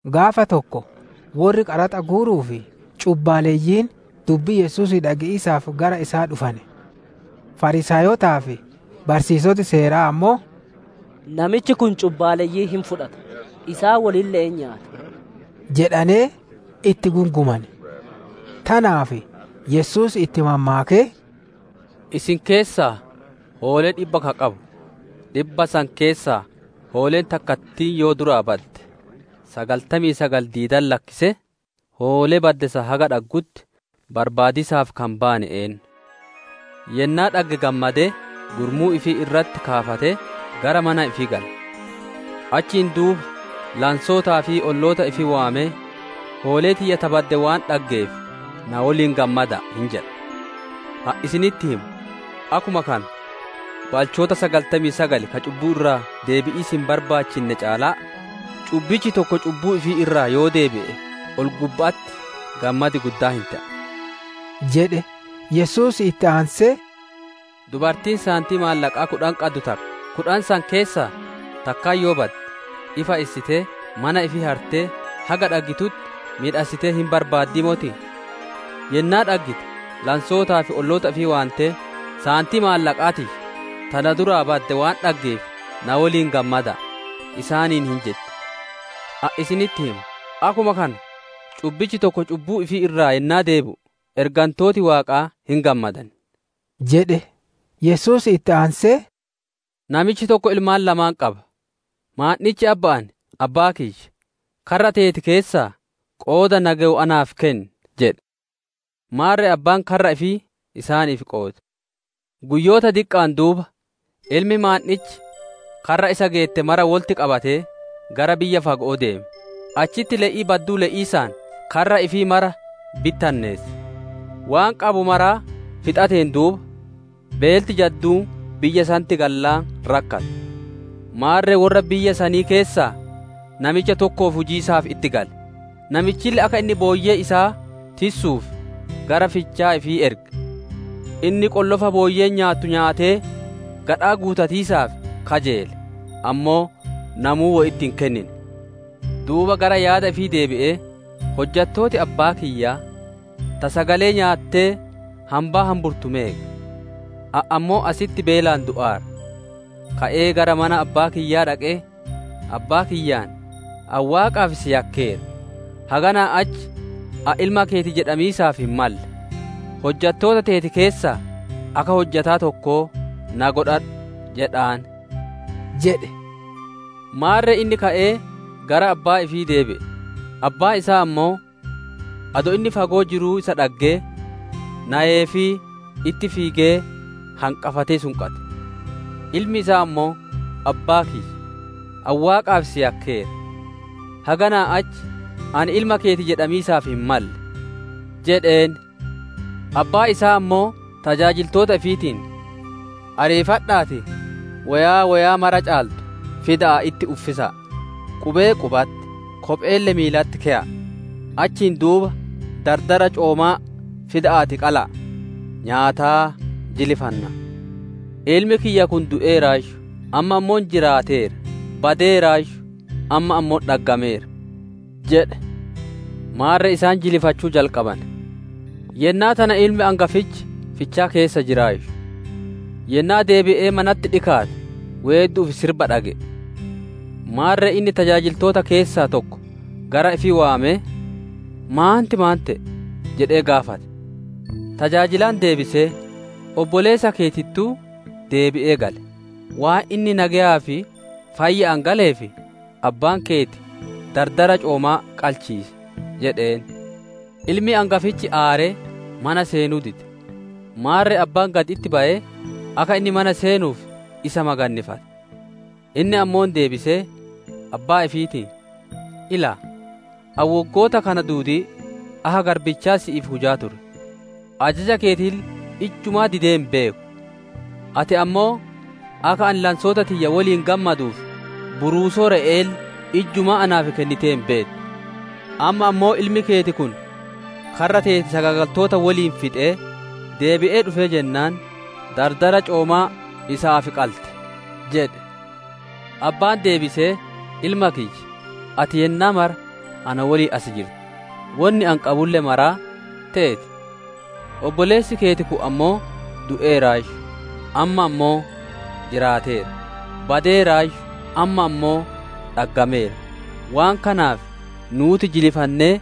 Gaafa tokko worri qaraxa guuruu fi cubbaaleyyiin dubbii Yesuusii dhage'iisaaf gara isaa dhufane. Fariisaayotaa fi barsiisoti Seeraa ammoo, «Namichi kun cubbaaleyyii hin fudhata, isaan wolille'een nyaata» jedhanee itti gungumane. Tanaaf Yesuus itti mammaakee, «Isin keessaa hoolee dhibba ka qabu, dhibba san keessaa hooleen takkattiin yoo duraa badde, sagaltamii sagali diidatti lakkisee hoolee badde san haga dhaggutti barbaadiisaaf ka hin baane eennu? Yennaa dhagge gammadee gurmuu ifii irratti kaafatee, gara mana ifii gala. Achiin duuba lansootaa fi olloota ifii waamee, ‹Hoolee tiyya ta badde waan dhaggeef na woliin gammada'a!› hin jedha. Ani isinitti hima, akkuma kana, balchoota sagaltamii sagali ka cubbuu irraa deebi'iisi hin barbaachinne caalaa, cubbichi tokko cubbuu ifii irraa yoo deebi'e ol gubba'atti gammadi guddaan hin te'a» jedhe. Yesuus itti aansee, «Dubartiin saantii maallaqaa kudhan qaddu takka kudhan san keessaa takkaan yoo badde, ifa issitee, mana ifii hartee haga dhaggitutti miidhassitee hin barbaaddii motii? Yennaa dhaggite lansootaa fi olloota ifii waantee, ‹Saantii Maallaqaa tiyya, ta na duraa badde waan dhaggeef na woliin gammada'a!› isaaniin hin jetti. Ani isinitti hima; akkuma kana cubbichi tokko cubbuu ifii irraa yennaa deebi'u ergantooti Waaqaa hin gammadan» jedhe. Yesuus itti aansee, «Namichi tokko ilmaan lamaan qaba. Maandhich abba'aan ‹Abbaa kiyya, karra teeti keessaa qooda na gewu naaf kenni!› jedhe. Maarre abbaan karra ifii isaaniif qoode. Guyyoota diqqa'aan duuba ilmi maandhich karra isa geette mara wolitti qabatee gara biyya fago'oo deeme; achitti le'ii badduu le'iisaan karra ifii mara bittinneesse. Waan qabu maraa fixateen duuba, beelti jadduun biyya sanitti gallaan rakkate. Maarre worra biyya sanii keessaa namicha tokkoof hujiisaaf itti gale; namichille akka inni booyyee isaa tissuuf gara fichaa ifii erge. Inni qollofa booyyeen nyaattu nyaatee gadhaa guutatiisaaf kajeele, ammoo namuu wo itti hin kennine. «Duuba inni gara yaada ifii deebi'ee, ‹Hojjattooti abbaa kiyyaa ta sagalee nyaattee hambaa hambittu meeqa? Ani ammoo asitti beelaan du'aara. Ka'ee gara mana abbaa kiyyaa dhaqee, abbaa kiyyaan: Ani Waaqaa fi si yakkeera; haganaa achi ani ilma keeti jedhamiisaaf hin malle; hojjattoota teeti keessaa akka hojjataa tokkoo na godhadhu jedhaan› jedhe. «Maarre inni ka'ee gara abbaa ifii deebi'e. Abbaan isaa ammoo, adoo inni fagoo jiruu isa dhaggee, nayeefii itti fiigee hanqafatee sunqate. «Ilmi isaa ammoo, ‹Abbaa kiyya, ani Waaqaa fi si yakkeera. Haganaa achi ani ilma keeti jedhamiisaaf hin malle› jedheen. «Abbaan isaa ammoo tajaajiltoota ifiitiin, ‹Ariifadha'aatii, woyaa, woyaa mara caaltu fida'aatii itti uffisa'a; qubee qubatti, kopheelle miilatti keya'a! Achiin duuba dardara coomaa fida'aatii qala'a, nyaataa jilifanna. Ilmi kiyya kun du'eeraayyu, amma ammoo jiraateera, badeeraayyu amma ammoo dhaggameera› jedhe. Maarre isaan jilifachuu jalqabane. «Yennaa tana ilmi angafichi fichaa keessa jiraayyu. Yennaa deebi'ee manatti dhikaate weeddu'uu fi sirba dhage'e. Maarre inni tajaajiltoota keessaa tokko gara ifii waamee, ‹Maanti maan te'e?› jedhee gaafate. Tajaajilaan deebisee, ‹Obboleessa keetittuu deebi'ee gale; waan inni nageyaa fi fayya'aan galeef, abbaan keeti dardara coomaa qalchiise› jedheen. Ilmi angafichi aaree mana seenuu dide; maarre abbaan gad itti bayee, akka inni mana seenuuf isa magannifate. Inni ammoo deebisee abbaa ifiitiin, ‹Ilaa, ani woggoota kana duudii akka garbichaa si'iif hujaa ture, ajaja keetille ijjumaa didee hin beeku; ati ammoo akka ani lansoota tiyya woliin gammaduuf buruusoo re'e'eelle ijjumaa naaf kennitee hin beettu! Amma ammoo ilmi keeti kun karra teeti sagaagaltoota woliin fixee, deebi'ee dhufee jennaan, dardara coomaa isaaf qalte!› jedhe. Abbaan deebisee, ‹Ilma kiyya, ati yennaa mara na woliin as jirta, wonni ani qabulle maraa teeti. Obboleessi keeti kun ammoo du'eeraayyu, amma ammoo jiraateera; badeeraayyu amma ammoo dhaggameera; waan kanaaf nuuti jilifannee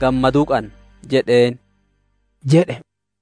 gammaduu qanna› jedheen» jedhe.